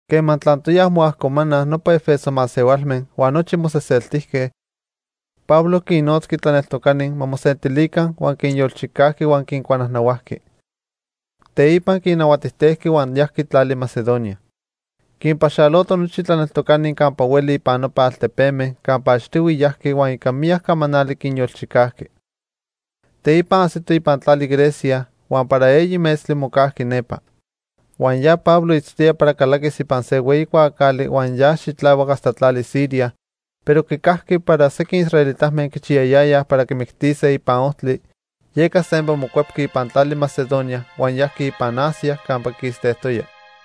Quema tlantoyaj moajcomanaj nopa 'Efeso masehualme huan nochi moseseltijque, Pablo quinnotzqui tlaneltocani ma mosentilica huan quinyolchicajqui huan quincuanajnahuajqui. Teipa quinnahuatijtejqui huan yajqui tlali Macedonia. Quinpaxaloto nochi tlaneltocani campa hueli ipan nopa altepeme campa achtihui yajqui huan ica miyac camanali quinyolchicajqui. Teipa ajsito ipan tlali Grecia, huan para eyi metztli mocajqui nepa. Huan ya Pablo itztoya para calaquis ipan se hueyi cuaacali huan yas xitlahuac hasta tlali Siria, pero quicajqui para sequin israelitame quichiyayayaj para quimictise ipan ojtli, yeca sempa mocuepqui ipan tlali Macedonia huan yajqui ipan Asia campa quistejtoya.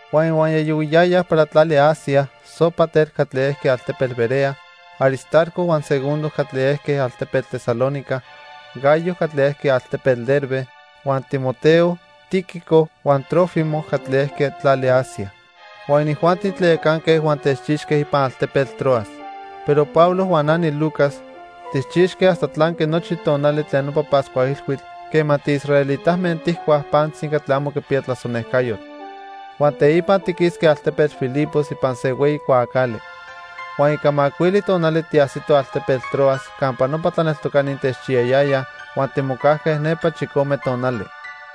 Huan ihuaya yohuiyayaj para tlali Asia, Sópater catli ejqui altepetl Berea, Aristarco huan Segundo catli ejque altepetl Tesalónica, Gayo catli ejqui altepetl Derbe, huan Timoteo, Tíquico huan Trófimo catli ejque tlali Asia. Huan inijuanti tlayacanque huan techchixque ipan altepetl Troas. Pero Pablo huan na niLucas, tijchixque hasta tlanqui nochi tonali tlen nopa Pascua Ilhuitl quema tiisraelitame tijcuaj pantzi catli amo quipiya tlasonejcayotl. Huan teipa tiquisque altepetl Filipos ipan se hueyi cuaacali. Huan ica macuili tonali tiajsitoj altepetl Troas campa nopa tlaneltocani techchiyayayaj huan timocajque nepa chicome tonali.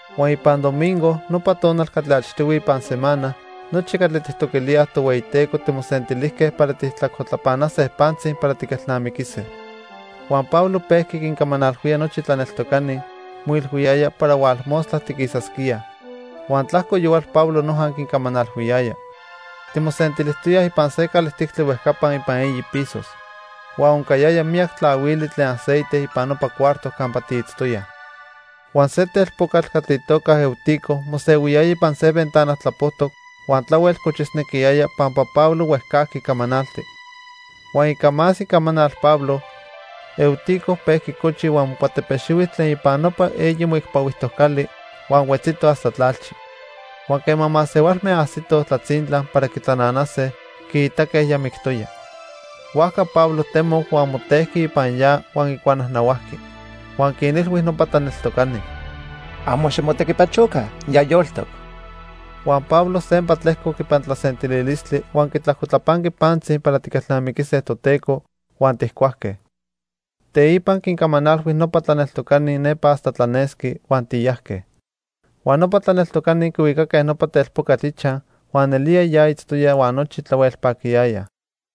Huan ipan domingo, nopa tonal catli achtihui ipan semana, nochi catli tijtoquilíaj Tohueyiteco timosentilijque para tijtlajcotlapanase pantzi para tiquelnamiquise. Huan Pablo pejqui quincamanalhuía nochi tlaneltocani, moilhuiyaya para hualmostla tiquisasquíaj. Huan tlajco yohual Pablo noja quincamanalhuiyaya. Timosentilijtoyaj ipan se calijtictli huejcapa ipan eyi pisos. Huan oncayaya miyac tlahuili tlen aceite ipan nopa cuarto campa tiitztoyaj. Huan se telpocatl catli itoca Eutico mosehuiyaya ipan se ventana tlapojtoc huan tlahuel cochisnequiyaya pampa Pablo huejcajqui camanaltic. Huan ica más icamanal Pablo, Eutico pejqui cochi huan mocuatepexihui tlen ipan nopa eyi moicpahuijtoc cali, huan huetzito hasta tlalchi. Huan quema masehualme ajsitoj tlatzintla para quitlananase, quiitaque ya mictoya. Huajca Pablo temoc huan motejqui ipan ya huan quicuanajnahuajqui. Huan quinilhui nopa tlaneltocani: —Amo ximotequipachoca. Ya yoltoc. Huan Pablo sempa tlejcoc ipan tlasentililistli huan quitlajcotlapanqui pantzi para tiquelnamiquise Toteco, huan tijcuajque. Teipa quincamanalhui nopa tlaneltocani nepa hasta tlanesqui, huan tiyajque. Huan nopa tlaneltocani quihuicaque nopa telpocatl ichaj huan nelía ya itztoya huan nochi tlahuel paquiyayaj.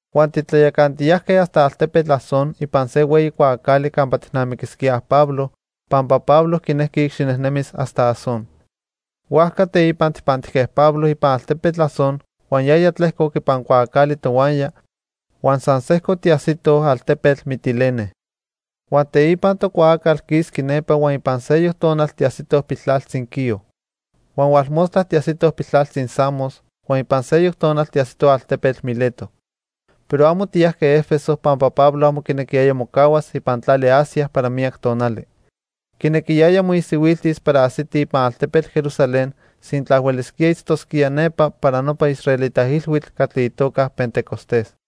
Huan titlayacantiyajque hasta altepetl Asón ipan se hueyi cuaacali campa tijnamiquisquíaj Pablo, pampa Pablo quinejqui icxinejnemis hasta Asón. Huajca teipa tijpantijque Pablo ipan altepetl Asón huan yaya tlejcoc ipan cuaacali tohuaya, huan san sejco tiajsitoj altepetl Mitilene. Huan teipa tocuaacal quisqui nepa huan ipan seyoc tonal tiajsitoj piltlaltzi Quío. Huan hualmostla tiajsitoj piltlaltzi Samos, huan ipan seyoc tonal tiajsitoj altepetl Mileto. Pero amo tiyajque 'Efeso pampa Pablo amo quinequiyaya mocahuas ipan tlali Asia para miyac tonali. Quinequiyaya moisihuiltis para ajsiti ipan altepetl Jerusalén sintla huelisquía itztosquía nepa para nopa israelita ilhuitl catli itoca Pentecostés.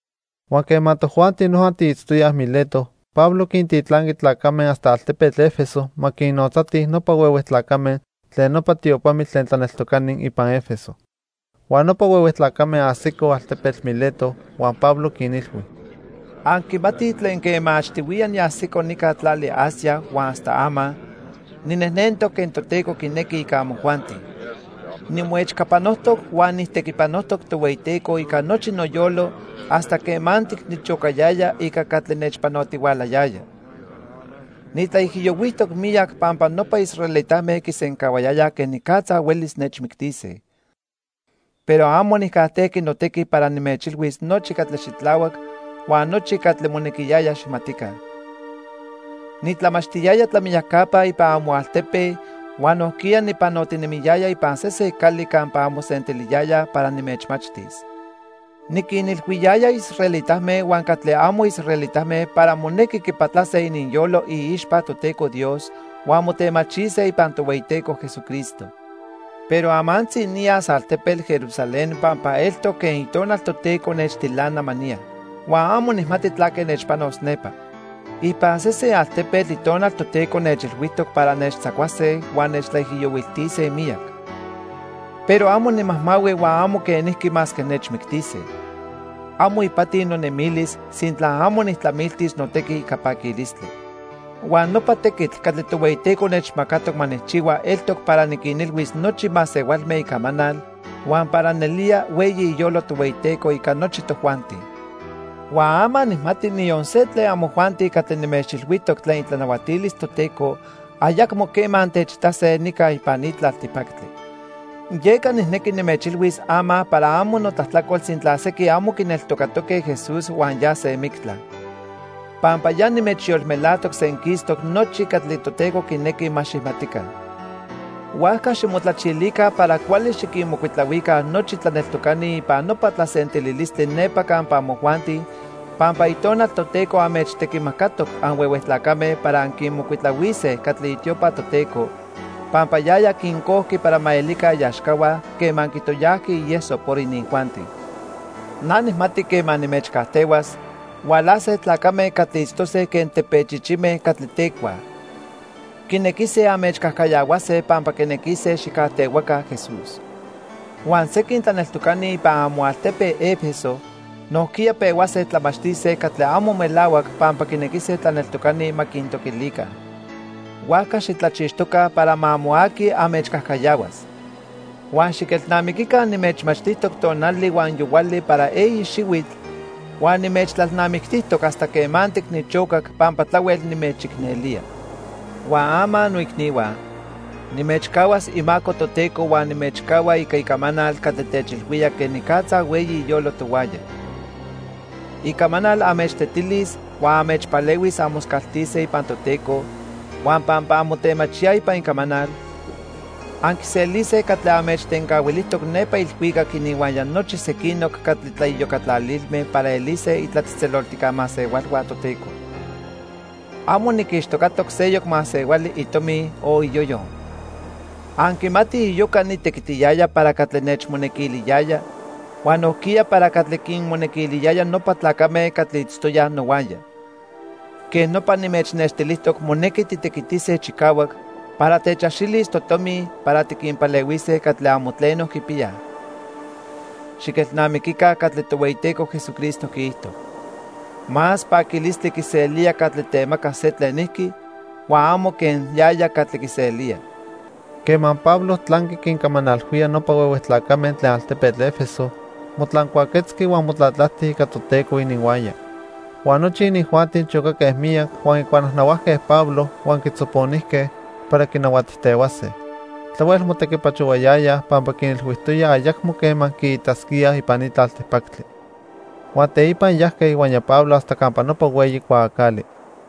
Huan quema tojuanti noja tiitztoyaj Mileto, Pablo quintitlanqui tlacame hasta altepetl 'Efeso ma quinnotzatij nopa huehue tlacame tlen nopa tiopamitl tlen tlaneltocani ipan 'Efeso. Huan nopa huehue tlacame ajsicoj altepetl Mileto huan Pablo quinilhui: "Anquimatij tlen quema achtihuiya niajsico nica tlali Asia huan hasta ama, ninejnentoc quen Toteco quinequi ica amojuanti. Nimoechcapanojtoc huan nijtequipanojtoc Tohueyiteco ica nochi noyolo hasta quemantic nichocayaya ica catli nechpanotihualayaya. Nitlaijiyohuijtoc miyac pampa nopa israelitame quisencahuayayaj quenicatza huelis nechmictise. Pero amo nijcajtejqui notequi para nimechilhuis nochi catli xitlahuac huan nochi catli monequiyaya xijmatica. Nitlamachtiyaya tlamiyacapa ipan amoaltepe huan nojquiya nipanotinemiyaya ipan sesen cali campa anmosentiliyayaj para nimechmachtis. Niquinilhuiyaya israelitame huan catli amo israelitame para monequi quipatlase ininyolo iixpa Toteco Dios huan motemachise ipan Tohueyiteco Jesucristo. Pero amantzi niyas altepetl Jerusalén pampa eltoc quen Itonal Toteco nechtilana ma niya. Huan amo nijmati tlaque nechpanos nepa. Ipan sesen altepetl Itonal Toteco nechilhuijtoc para nechtzacuase huan nechtlaijiyohuiltise miyac. Pero amo nimajmahui huan amo quenijqui masque nechmictise. Amo ipati nonemilis sintla amo nijtlamiltis notequi ica paquilistli. Huan nopa tequitl catli Tohueyiteco nechmacatoc ma nijchihua eltoc para niquinilhuis nochi masehualme icamanal huan para nelía hueyi iyolo Tohueyiteco ica nochi tojuanti. "Huan ama nijmati niyon se tlen amojuanti catli nimechilhuijtoc tlen itlanahuatilis Toteco ayacmo quema antechitase nica ipan ni tlaltipactli. Yeca nijnequi nimechilhuis ama para amo notlajtlacol sintla sequin amo quineltocatoque Jesús huan yase mictla. Pampa ya nimechyolmelajtoc senquistoc nochi catli Toteco quinequi ma xijmatica. Huajca ximotlachilica para cuali xiquinmocuitlahuica nochi tlaneltocani ipan nopa tlasentililistli nepa campa amojuanti pampa Itonal Toteco anmechtequimacatoc anhuehue tlacame para anquinmocuitlahuise catli itiopa Toteco pampa yaya quincojqui para ma elica iaxcahua quema quitoyajqui ieso por inijuanti. Na nijmati quema nimechcajtehuas, hualase tlacame catli itztose quen tepechichime catli tecuaj. Quinequise anmechcajcayahuase pampa quinequise xijcajtehuaca Jesús. Huan sequin tlaneltocani ipan amoaltepe 'Efeso nojquiya pehuase tlamachtise catli amo melahuac pampa quinequise tlaneltocani ma quintoquilica. Huajca xitlachixtoca para ma amo aqui anmechcajcayahuas. Huan xiquelnamiquica nimechmachtijtoc tonali huan yohuali para eyi xihuitl, huan nimechtlalnamictijtoc hasta quemantic nichocac pampa tlahuel nimechicnelía. "Huan ama noicnihua, nimechcahuas imaco Toteco huan nimechcahua ica icamanal catli techilhuía quenicatza hueyi iyolo tohuaya. Icamanal anmechtetilis huan anmechpalehuis anmoscaltise ipan Toteco huan pampa anmotemachíaj ipan icamanal, anquiselise catli anmechtencahuilijtoc nepa ilhuicac ininhuaya nochi sequinoc catli tlaiyocatlalilme para elise itlatzejtzeloltijca masehualhua Toteco. Amo niquixtocatoc seyoc masehuali itomi o iyoyo. Anquimatij iyoca nitequitiyaya para catli nechmonequiliyaya huan nojquiya para catli quinmonequiliyaya nopa tlacame catli itztoyaj nohuaya. Quej nopa nimechnextilijtoc monequi titequitise chicahuac para techaxilis totomi para tiquinpalehuise catli amo tleno quipiyaj. Xiquelnamiquica catli Tohueyiteco Jesucristo quiijto: 'Más paquilistli quiselía catli temaca se tlenijqui, huan amo quen yaya catli quiselía.' " Quema Pablo tlanqui quincamanalhuía nopa huehue tlacame tlen altepetl 'Efeso, motlancuaquetzqui huan motlatlajti ica Toteco ininhuaya. Huan nochi inijuanti chocaque miyac huan quicuanajnahuajque Pablo huan quitzoponijque para quinahuatijtehuase. Tlahuel motequipachohuayayaj pampa quinilhuijtoya ayacmo quema quiitasquíaj ipan ni tlaltipactli. Huan teipa yajque ihuaya Pablo hasta campa nopa hueyi cuaacali.